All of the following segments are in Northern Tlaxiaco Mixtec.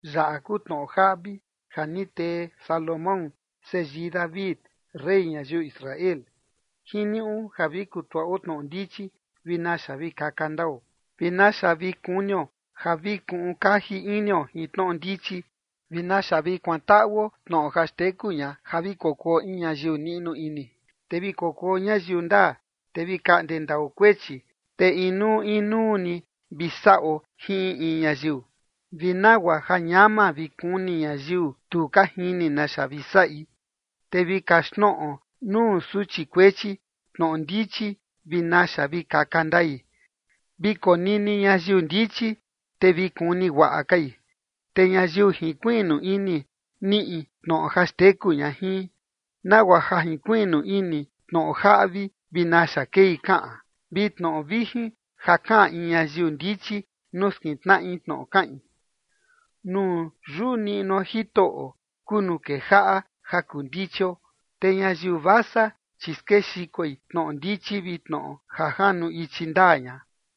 Yaꞌa kuu tnoꞌo jaꞌvi ja ni tee Salomón, seyii David, rey ñayiu Israel. Jiniuꞌu ja vi kutuaꞌo tnoꞌo ndichi vi naxa vi kaka ndao, vi naxa vi kunio ja vi kuꞌun kaji inio jin tnoꞌo ndichi, vi naxa vi kuantaꞌuo tnoꞌo ja xteku ña ja vi kokuo in ñayiu niꞌnu ini, te vi kokuo ñayiu ndaa, te vi kaꞌnde ndao kuechi, te inuu inuu ni vi saꞌo jin in in ñayiu, vi nagua ja ñama vi kuni ñayiu tu ka jini naxa vi saꞌi, te vi kaxtnoꞌo nuu suchi kuechi tnoꞌo ndichi vi naxa vi kaka ndai. Vi konini ñayiu ndichi, te vi kuni guaꞌa kai te ñayiu jinkuiꞌnu ini niꞌi tnoꞌo ja xteku ña jin, nagua ja junkuiꞌnu ini tnoꞌo jaꞌvi vi naxa kei kaꞌan, vi tnoꞌo vijin ja kaꞌan in ñayiu ndichi nuu skintnaꞌi tnoꞌo kaꞌin. Nuu yuꞌu niꞌnuo Jitoꞌo kuu nuu kejaꞌa ja kuu ndichio. Te ñayiu vasa, chi skexikoi tnoꞌo ndichi vi tnoꞌo ja janu ichi ndaa ña.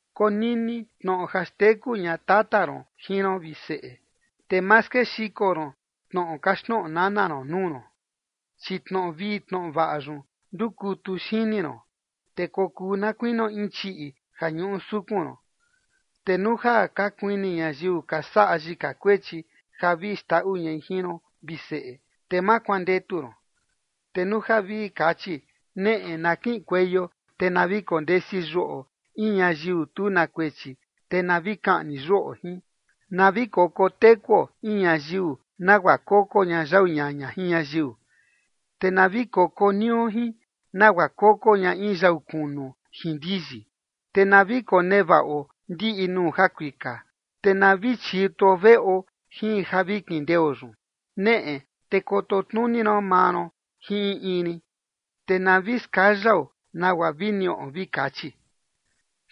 Konini tnoꞌo ja xteku ña tata ron jin ron, vi seꞌe, te ma skexiko ron tnoꞌo kaxtnoꞌo nana ron nuu ron, chi tnoꞌo vii tnoꞌo vaꞌa yun ndukutu xini ron, te kokuu na kuinio in chiꞌi ja ñuꞌu sukun ron. Te nuu ja ka kuini ñayiu ka saꞌa yika kuechi ja vi xndaꞌu ñai jin ron, vi seꞌe, te ma kuandetu ron. Te nuu ja vi kachi: “Neꞌe, na kiꞌinkueio, te na vi kondesi yuꞌo in ñayiu tu na kuechi, te na vi kaꞌni yuꞌo jin. Na vi koko tekuo in ñayiu nagua koko ña yau ñaña jin ñayiu, te na vi koko nio jin nagua koko ña in yau kunu jin ndiyi. Te na vi konevaꞌo ndiꞌi nuu jakuika, te na vi chituo veꞌo jin ja vi kindeo yun. Neꞌe te kototnuni ron maa ron jin in in rin, te na vi skayao nagua vi niꞌo”, vi kachi.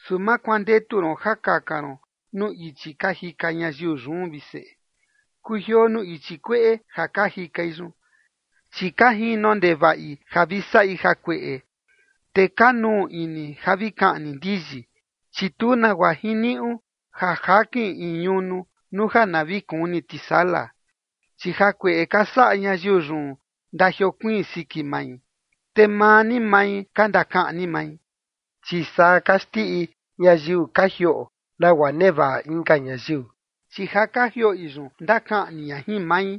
Su ma kuandetu ron ja kaka ron nuu ichi ka jika ñayiu yun, vi seꞌe. Kujioo nuu ichi kueꞌe ja ka jikai yun, chi ka jino ndevaꞌi ja vi saꞌi jakueꞌe, te ka nuu ini ja vi kaꞌni ndiyi. Chi tu nagua jiniuꞌu ja jakin in ñunu, nuu ja na vi kuni tisala. Chi jakueꞌe ka saꞌa ñayiu yun ndajiokuiin siki mai, te maa ni mai ka ndakaꞌni mai. Chi saa ka xndiꞌi ñayiu ka jioꞌo nagua nevaꞌa inka ñayiu, chi ja ka jioꞌi yun, ndakaꞌni ña jin mai.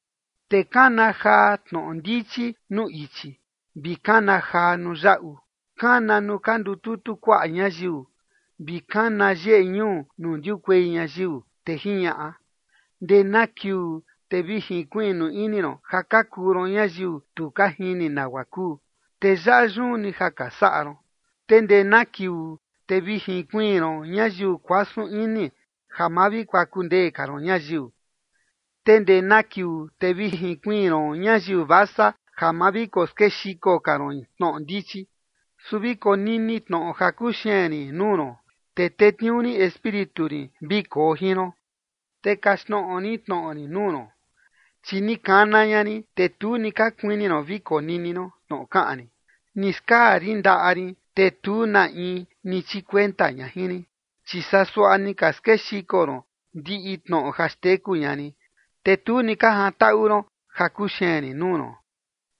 Te kana jaa tnoꞌo ndichi nuu ichi, vi kana jaa nuu yaꞌu. Kana nuu ka kututu kuaꞌa ñayiu, vi kana yeꞌe ñuu nuu ndiukuei ñayiu, te jiñaꞌa: “¿Ndee na kiuu te vi jinkuiꞌnu ini ron ja ka kuu ron ñayiu tu ka jini nagua kuu, te yaꞌa yun ni ja ka saꞌa ron? ¿Te ndee na kiuu te vi jinkuiin ron ñayiu kuasun ini, ja ma vi kokuaku ndee ka ron ñayiu? ¿Te ndee na kiuu te vi jinkuiin ron ñayiu vasa ja ma vi koskexiko ka ron tnoꞌo ndichi? Su vi konini tnoꞌo ja kuxeen rin nuu ron, te tetniuu rin Espíritu rin vi koo jin ron, te kaxtnoꞌo rin tnoꞌo rin nuu ron. Chi ni kana ña rin, te tu ni ka kuini ron vi konini ron tnoꞌo kaꞌan rin. Ni skaa rin ndaꞌa rin, te tu na in ni chikuenta ña jin rin, chi saa suaꞌa ni ka skexiko ron ndiꞌi tnoꞌo ja xteku ña rin, te tu ni ka jantaꞌu ron ja kuxeen rin nuu ron.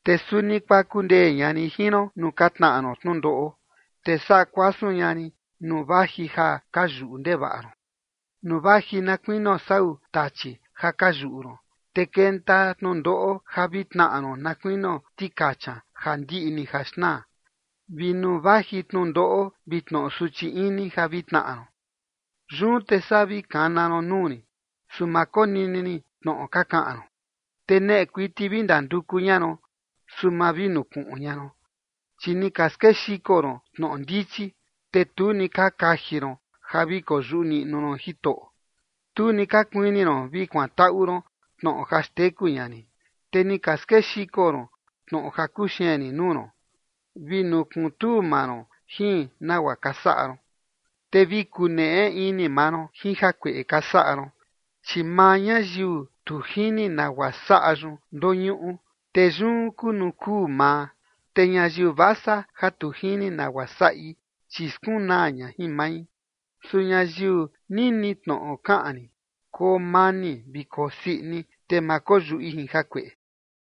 Te suni kuaku ndee ña rin jin ron nuu ka tnaꞌa ron tnundoꞌo, te saꞌa kuasun ña rin nuu vaji ja ka yuꞌu ndevaꞌa ron, nuu vaji na kuinio sau tachi ja ka yuꞌu ron, te kenta tnundoꞌo ja vi tnaꞌa ron na kuinio tikacha ja ndiꞌi ni ja xnaa vi nuu vaji tnundoꞌo vi tnoꞌo suchi ini ja vi tnaꞌa ron. ’Yun te saa vi kana ron nuu rin, su ma konini rin tnoꞌo ka kaꞌan ron. Te neꞌe kuiti vi ndanduku ña ron, su ma vi nukuꞌun ña ron. Chi ni ka skexiko ron tnoꞌo ndichi, te tu ni ka kaji ron ja vi koyuꞌu niꞌnu ron Jitoꞌo. Tu ni ka kuini ron vi kuantaꞌu ron tnoꞌo ja xteku ña rin, te ni ka skexiko ron tnoꞌo ja kuxeen rin nuu ron, vi nukuntuu maa ron jin nagua ka saꞌa ron, te vi kuneꞌe ini maa ron jin jakueꞌe ka saꞌa ron. Chi maa ñayiu tu jini nagua saꞌa yun, ndoñuꞌu, te yun kuu nuu kuu maa. Te ñayiu vasa ja tu jini nagua saꞌi, chi skunaa ña jin mai. Su ñayiu nini tnoꞌo kaꞌan rin, koo mani vi koo sii ini, te ma koyuꞌi jin jakueꞌe.”